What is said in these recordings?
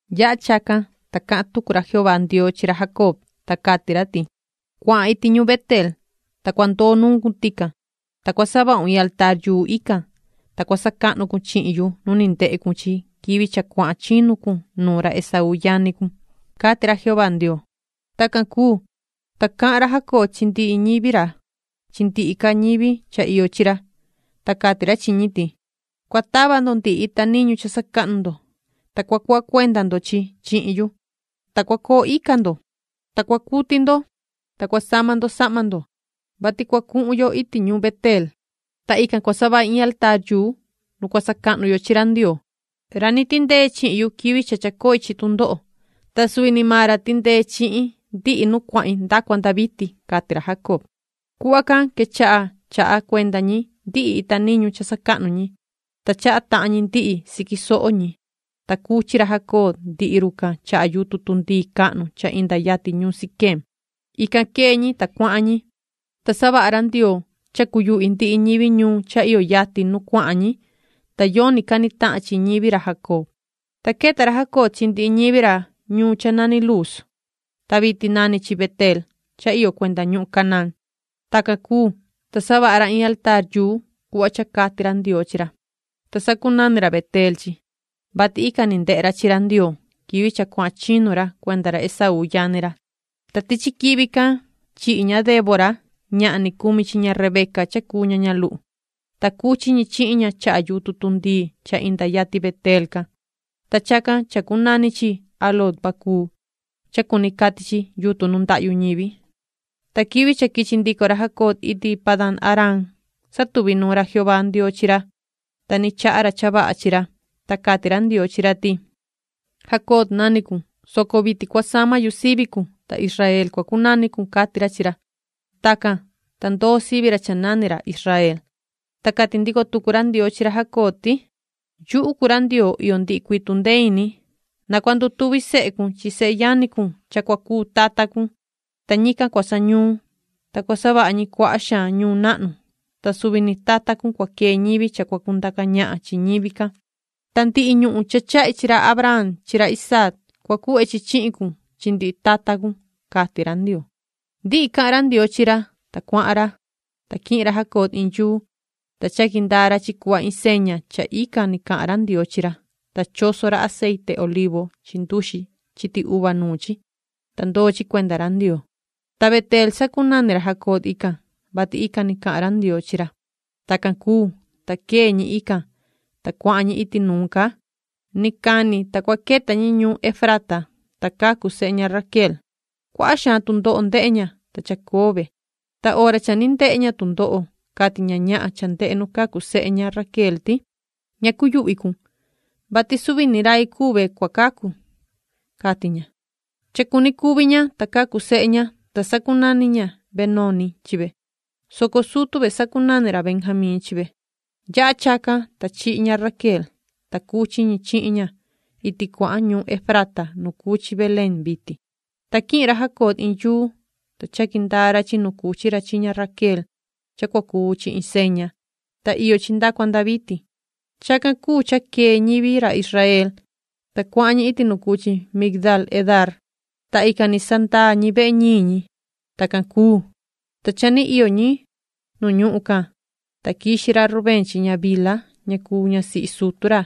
Yaha chacan, ta cahan tucu ra Jehová Ndioo chi ra Jacob, ta cati ra ti: “Cuahan iti ñuun Beteel, ta cua ndoo nuun cun tican. Ta cua savahun in altaar ican, ta cua sacahnu cun chihin yu nu ni ndehe cun chi quivi cha cuahan chinu cun nuun ra Esaú yani cun”, cati ra Jehová Ndioo. Tacan cuu, ta cahan ra Jacob chi ndihi ñivi ra chi ndihi ca ñivi cha iyo chi ra, ta cati ra chi ñi ti: ―Cua tava ndo ndihi ita niñu cha sacahnu ndo, ta cua cuhva cuenda ndo chihin yu, ta cua coo ica ndo, ta cua cuti ndo, ta cua sama ndo sahma ndo, vati cua cuhun yo iti ñuun Beteel, ta ican cua savahi in altaar nu cua sacahnu yo chi ra Ndioo, ra ni tindee chihin yu quivi cha chacoi chi tundoho, ta suvi ni maan ra tindee chihin ndihi nu cuahin nda cua nda vitin ―cati ra Jacob. Cuhva can quechaha chaha cuenda ñi ndihi ita niñu cha sacahnu ñi, ta chaha tahan ñi ndihi siqui soho ñi, ta cuchi ra Jacob ndihi run chaha yutun tundii cahnu cha inda yatin ñuun Siquem. Ican quee ñi, ta cuahan ñi, ta savaha ra Ndioo cha cuyuhvi ndihi ñivi ñuun cha iyo yatin nu cuahan ñi, ta yoni cani tahan chi ñivi ra Jacob. Ta queta ra Jacob chi ndihi ñivi ra ñuun cha nani Luuz, ta vitin nani chi Beteel cha iyo cuenda ñuhun Canaán. Tacan cuu, ta savaha ra in altaar cuhva cha cati ra Ndioo chi ra, ta sacunani ra Beteel chi, vati ican ni ndehe ra chi ra Ndioo quivi cha cuahan chinu ra cuenda ra Esaú yani ra. Ta tichi quivi can chihi ña Débora ñahan ni cumi chi ña Rebeca cha cuu ña ñaluhu, ta cuchi ñi chihin ña chaha yutun tundii cha inda yatin Beteel can, ta chacan chacunani chi Aloon-bacuut cha cuni cati “Yutun nu ndahyu ñivi”. Ta quivi cha quichi ndico ra Jacob iti Padan-aram satuvi nuun ra Jehová Ndioo chi ra, ta ni chaha ra cha vaha chi ra. Ta cati ra Ndioo chi ra ti:”Jacob nani cun, soco vitin cua sama yu sivi cun, ta Israel cua cunani cun”, cati ra chi ra. Tacan, ta ndoo sivi ra cha nani ra Israel. Ta cati ndico tucu ra Ndioo chi ra Jacob ti: “Yuhu cuu ra Ndioo iyo ndihi cuii tundee ini, na cua ndutuvi sehe cun chi seyani cun cha cua cuu tata cun, ta ñican cua sañuun, ta cua savaha ñi cuaha xaan ñuun nahnu, ta suvi ni tata cun cua quee ñivi cha cua cundaca ñahan chi ñivi can. Ta ndihi ñuhun cha chahi chi ra Abraham chi ra Isaac cua cuhve chi chihin cun, chi ndihi tata cun”, cati ra Ndioo. Ndihi cahan ra Ndioo chi ra, ta cuahan ra. Ta quihin ra Jacob iin yuu, ta chaqui ndaa ra chi cuhva iin seña cha ican ni cahan ra Ndioo chi ra, ta choso ra aceite olivu chi nduxi chiti uva nuun chi, ta ndoo chi cuenda ra Ndioo. Ta Beteel sacunani ra Jacob ican, vati ican ni cahan ra Ndioo chi ra. Tacan cuu, ta quee ñi ican, ta cuahan ñi iti nuun ca. Ni cani ta cua queta ñi ñuun Efrata, ta cacu sehe ña Raquel. Cuaha xaan tundoho ndehe ña, ta chacoo ve. Ta hora cha ni ndehe ña tundoho cati ña ñahan cha ndehe nu cacu sehe ña Raquel ti: “Ña cuyuhvi cun, vati suvi ni rai cuu ve cua cacu”, cati ña. Cha cuni cuvi ña, ta cacu sehe ña, ta sacunani ña Benoni chi ve, soco sutu ve sacunani ra Benjamín chi ve. Yaha chacan, ta chihi ña Raquel, ta cuchi ñi chihin ña iti cuahan ñuun Efrata nu cuu chi Belén vitin. Ta quihin ra Jacob iin yuu, ta chaqui ndaa ra chi nu cuchi ra chi ña Raquel cha cua cuu chi iin seña, ta iyo chi nda cua nda vitin. Chacan cuu cha quee ñivi ra Israel, ta cuahan ñi iti nu cuu chi Migdaal-edar, ta ican ni sandaa ñi vehe ñiin ñi. Tacan cuu, ta cha ni iyo ñi nu ñuhun can, ta quixi ra Rubén chi ña Bilha cha cuu ñasihi sutu ra,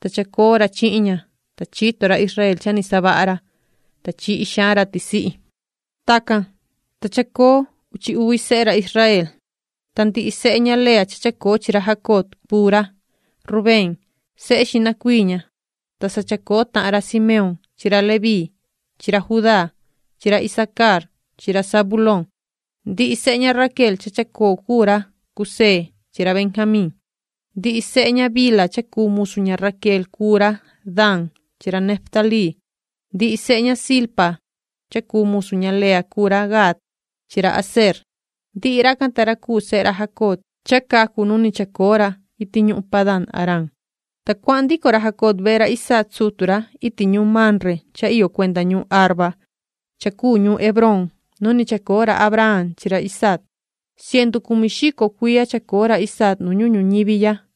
ta chacoo ra chihin ña, ta chito ra Israel cha ni savaha ra, ta chihi xaan ra tisihi. Uchi uvi sehe ra Jacoob Tacan, ta chacoo uchi uvi sehe ra Israel. Ta ndihi sehe ña Lea cha chacoo chi ra Jacob, cuu ra Rubén, sehe xihna cuii ña, ta sa chacoo tahan ra Simeón chi ra Leví chi ra Judá chi ra Isacar chi ra Zabulón. Ndihi sehe ña Raquel cha chacoo cuu ra José chi ra Benjamín. Ndihi sehe ña Bilha cha cuu musu ña Raquel cuu ra Dan chi ra Neftalí. Ndihi sehe ña Zilpa cha cuu musu ña Lea cuu ra Gad chi ra Aser. Ndihi racan ta ra cuu sehe ra Jacob cha cacu nu ni chacoo ra iti ñuhun Padan-aram. Ta cuahan ndico ra Jacob vehe ra Isaac sutu ra iti ñuun Mamre cha iyo cuenda ñuhun Arba cha cuu ñuun Hebrón nu ni chacoo ra Abraham chi ra Isaac. Cientu cumi xico cuiya chacoo ra Isaac nu ñuhun ñuñivi ya.